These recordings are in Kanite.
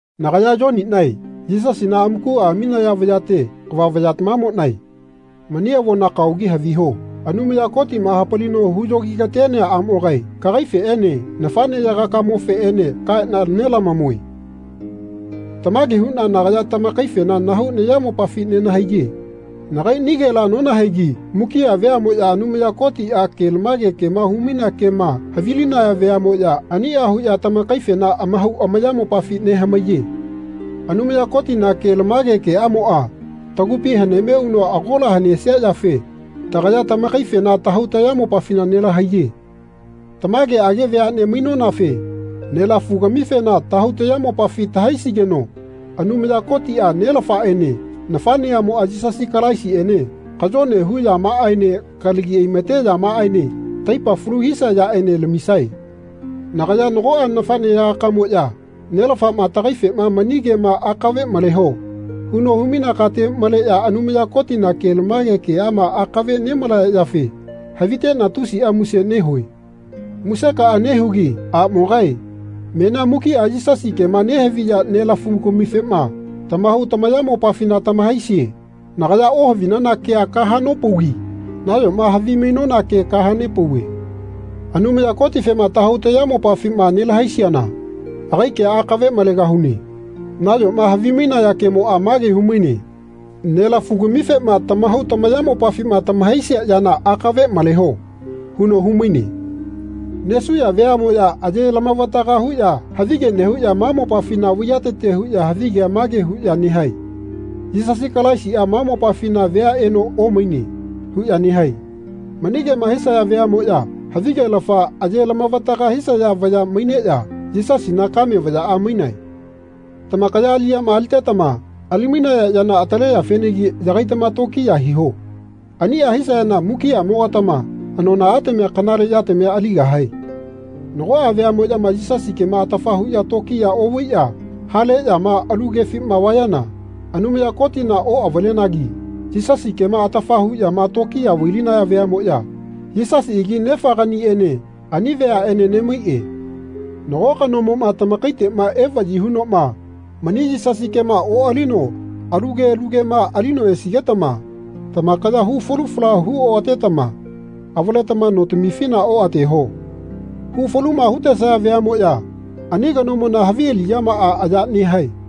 Nagaya Yoninae Yisasina amakua aminaya vayate kava vayatamamonae mani avona kaogi haviho. Anumaya Kotima hapalino huyogi-katenea amogae kagaifeene nafaneyagakamofeene kaena nelamamue. Tamage huna nagaya tamakaifena nahau nayamopafi nenahaiye. Nagainigela nonahaigi mukia veamoya Anumaya Kotia kelamage kema humainea kema havilinaya veamoya ania huya tamakaifena amahau amayamopafi nehamaiye. Anumaya Kotina kelamage keamoa tagupi haneme uno agola hanesia yafe tagaya tamakaifena tahau tayamopafina nelahaiye. Tamageage veane mainonafe nelafu-gamifena tahau tayamopafi tahaisigeno Anumaya Kotia, Nelafaene nafaneamoa Yisasi Kalaisiene kayone hu yamaaene kalagi aimate yamaaene taipa falu hisia yaene lamisae. Nagaya nagoa nafaneyagaka-moya Nelafama tagaifena Mani kema akave maleho. huno hu-mainea kate maleya Anumaya Kotina kelamage keama akave nemalaya yafe havitena tusia muse nehue. Musekaa nehugi amogae menia mukia Yisasi kema nehaviya nelamafu-gamifema tamahau tamayamopafina tamahaisie. Nagaya ohavinana kea kahanopaugi nayoma havimainona ke kahanepauve. Anumaya Kotifema tahau tayamopafima nelahaisiana agai kea akave malegahune. Nayoma havimainaya kemoa mage humaine Nelafu-gamifema tamahau tamayamopafima tamahaisia yana akave maleho. huno humaine. Nesuya veamoya aye lamavataga huya havige nehuya ma mopafina vaiyatete huya havigea mage huya nehae Yisasi Kalaisia ma mopafina vea eno omaine. huya nehae. Mani kema hisaya veamoya havigelafa aye lamavataga hisaya vaya maineya Yisasina kame vayaa mainae. Tamakaya aliyama alitetama ali-mainaya yana ataleyafenagi yagaitama tokiya hiho. Ania hisayana mukiamogatama anonaatamia kanale yatamia aligahae. Nagoa veamoyama Yisasi kema atafa huya tokiya ovaiya haleyama alu kefima vayana Anumaya Kotina oavalenagi Yisasi kema atafa huyama tokiya vai-linaya veamoya Yisasiagi Nefaganiene ani veaene nemaie. Nago kanomoma tamakaitema evayi hunoma mani Yisasi kema oalino alu ke alu kema alino esigetama tamakaya hu falu fala hu oatetama avaletama notamifina oateho. Hu faluma hutesaya veamoya ani kanomona havi aliyamaa aya nehae.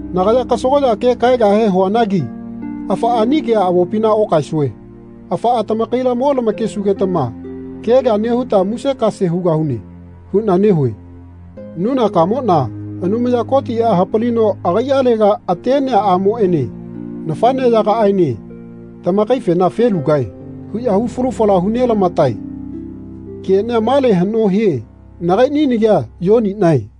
Nagaya kasagoya ke kaegahe huanagi Afaa ani kemoa avopina okaesue. Afaa tamakaila mo lamakesugetama kea kea nehuta musekase hugahune. huna nehue. Nunakamona Anumaya Kotia hapalino agaialega atenea amoene nafaneyagaaene tamakaifena Felugae. huya hu falu fala hu nelamatae. Kenia male hano hie. Nagaini nagia Yoninae.